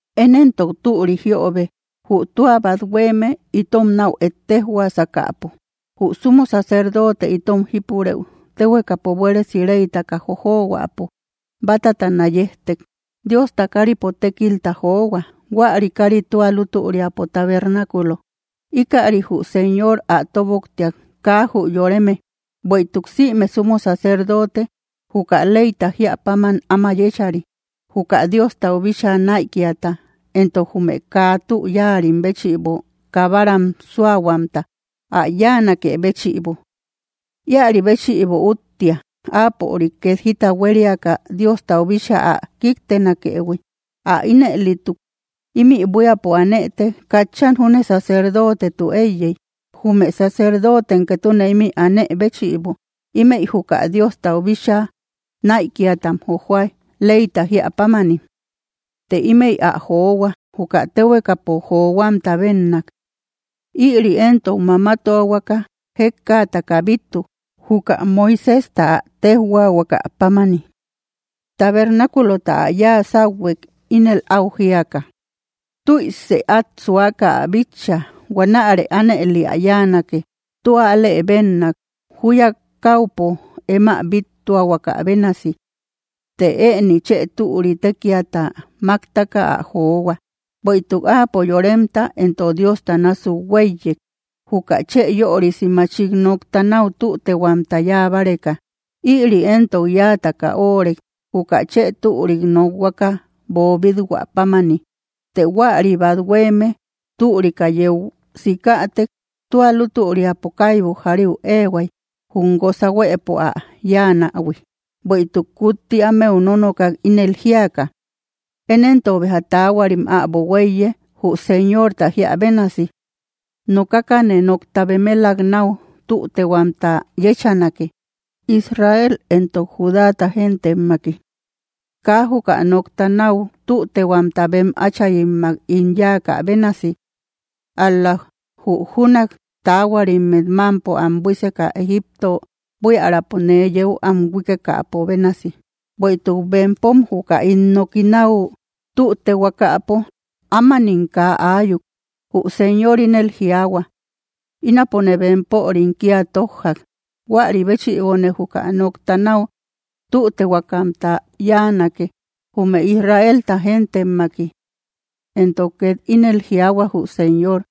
Én éntok türi jiöbe, jü tua bát huéeme itom náu ettejhuasakäpo, jü sumo sacerdote itom jípurëu, téhuekapo buéresi reytaka jojohuäpo bátatana yejtek. Diosta káripo tékilta johua. Huäri kári tua lútüriapo tabernáculo. Íkäri jü Señor ä tóboktiak, kaa jü yoreme. Bueïtuk sïme sumo sacerdote juka leyta jíä páman áma yéchari, juka Diostau bíchaa näikiata entok jume kaa tü yáarim béchïbo kabaram súahuamta ä yáanakë béchïbo. Íäri béchïbo úttia áapörik két jita huériaka Diostau bíchaa ä kíktenakëhui. Ä ínëlituk ímï buíapo anëtek, katchan júne sacerdotetu éiyey, jume sacerdotem ketune ímï anë béchïbo. Ímëi juka Diostau bíchaa näikiatam jojoa, leyta jíä pámani. Të ímëi ä johua, juka téhuekapo johuamta bénnak. Ïri éntok mamatuahuaka jékkaataka bíttu, juka Moiséjta ä téjhuaahuaka pámani. Tabernáculota ä yáa sáuhuek, ínel áu jíaka: “Tüise át suaka ä bitcha; huanäre ánëli ä yáanake, tua alë bénnak, júya káupo em ä bíttuahuaka bénasi.” Të ëni chë türi tékiata máktaka ä johua, bueïtuk Áapo yoremta entok Diosta násuk huéiyek, juka chë yörisi machik nokta náu tütehuamta yáa báreka. Ïri éntok yáataka óorek, juka chë türik nokhuaka boobít-hua pámani. Të huäri bát huéeme türika yeu sikätek, tua lútüriapo kaibu jariu éehuay, jum guosa huëpo ä yáanähui. Bueïtuk kutti ámeu nonokak, ínel jíaka: Én éntok béja taahuarim äbo huéiye, jü Señorta jíä bénasi. Nokakane nokta bemelak náu tütehuamta yéchanake, Israel entok Judáta gentemmaki. Kaa juka nokta náu tütehuamta bem áchayimmak ín yáakä bénasi, ál‑la jü júnak taahuarimmet mámpo am buíseka Egipto buiärapo nee yeu am huíkekäpo bénasi, bueïtuk bempom juka ín noki náu tütehuakapo, ámanim kaa aayuk, jü Señor ínel jiaahua: Ínapone bempörim kía tójjak. Huäri béchïbone juka nokta náu tütehuakamta yáanake, jume Israelta gentemmaki. Entok két ínel jiaahua jü Señor: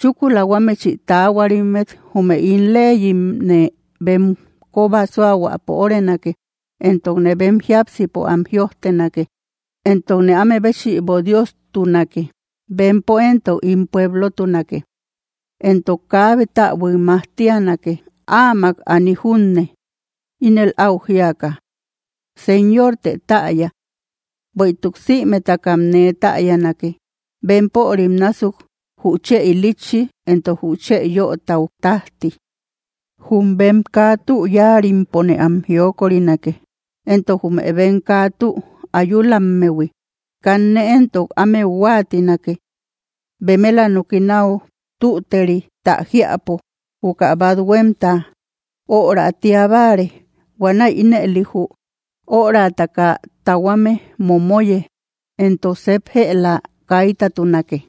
Chúkula huámechï taahuarimmet, jume ín leyimne bem kóba súahuapo órenake, entokne bem jíapsimpo am jïojtenake. Entokne áme béchïbo Diostunake; bempo éntok ín pueblotunake. Entok kaabe täbuik majtianake, áamak aani junne, ínel áu jíaka: Señortë täya. Bueïtuk sïmetakam nee täyanake, bempörim násuk jü chë ilitchi éntok jü chë yötau tájti. Jum bem kaa tü yáarimpone am jiokorinake; entok jume bem kaa tü ayulammehui, kanne éntok ámeu huáatinake. Bemela noki náu tüterita jiäpo, juka bát huémta öra tía báare. Huanäi ínëli jü örataka tahuame momoye, entok sep jëla kaitatunake.